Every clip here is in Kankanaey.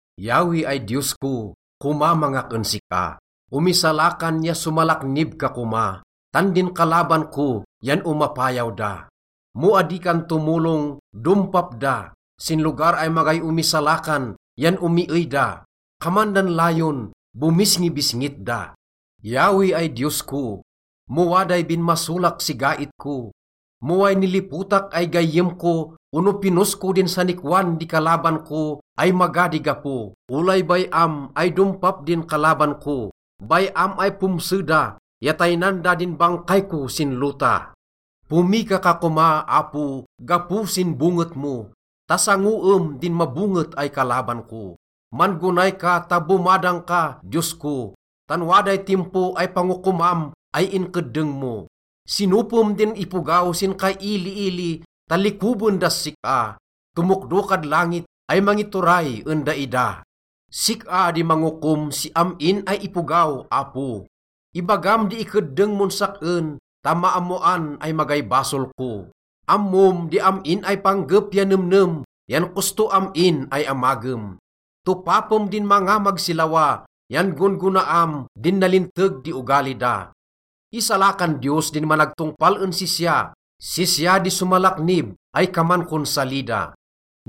Yahweh ay Diyos ko, komamangak en sik-a. Omisalakan ya somalaknib ka koma, tan din kalaban ko yan omapayaw da. Mo adi kan tomolong, dompap da, sin lugar ay magay omisalakan yan omiey da. Kaman dan layon, bomisngibisngit da. Yahweh ay Diyos ko, mo waday binmasolak si gait ko, mo way nilipotak ay gayyem ko ono pinos ko din sanikwan di kalaban ko ay maga di gapo, olay bay-am ay dompap din kalaban ko. Bay-am ay pomse da ya taynan da din bangkay ko sin lota. Pomika ka koma, Apo, gapo sin bonget mo ta sangoem din mabonget ay kalaban ko. Man-gonay ka ta bomadang ka, Diyos ko, tan waday timpo ay pangokomam ay inkeddeng mo. Sinopem din ipogaw sin kailiili ta likoben das sik-a. Tomokdo kad langit ay mangituray en daida. Sik-a di mangokom si am-in ay ipogaw, Apo. Ibagam di ikeddeng mon sak-en ta maammoan ay magay basol ko. Ammom di am-in ay panggep ya nemnem yan kosto am-in ay amagem. Topapem din mangamag si lawa yan gon-gonaam din nalinteg di ogali da. Isalakan Diyos din managtongpal en sisya. Sisya di somalaknib ay kaman kon salida.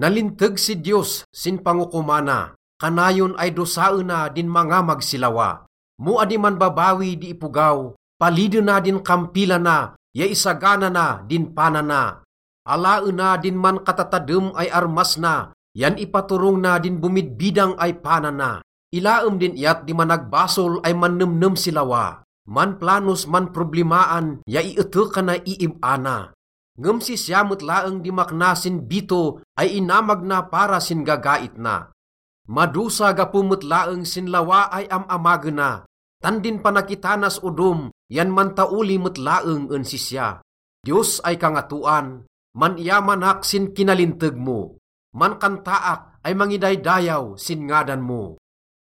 Nalinteg si Diyos sin pangokomana, kanayon ay dosaena din mangamag si lawa. Mo adi manbabawi di ipogaw, palidena din kampilana ya isagana na din pana na. Alaena din mankatatadem ay armas na yan ipaturong na din bomidbidang ay pana na. Ilaem din iyat di managbasol ay mannemnem si lawa. Manplanos manproblimaan ya ietekanay iib-a na. Ngem sisya met laeng di makna sin bito ay inamag na para sin gagait na. Madosa gapo met laeng sin lawa ay am-amagena tan din panakitanas odom yan mantaoli met laeng en sisya. Diyos ay Kangatoan, man-iyamanak sin kinalinteg mo. Mankantaak ay mangidaydayaw sin ngadan mo.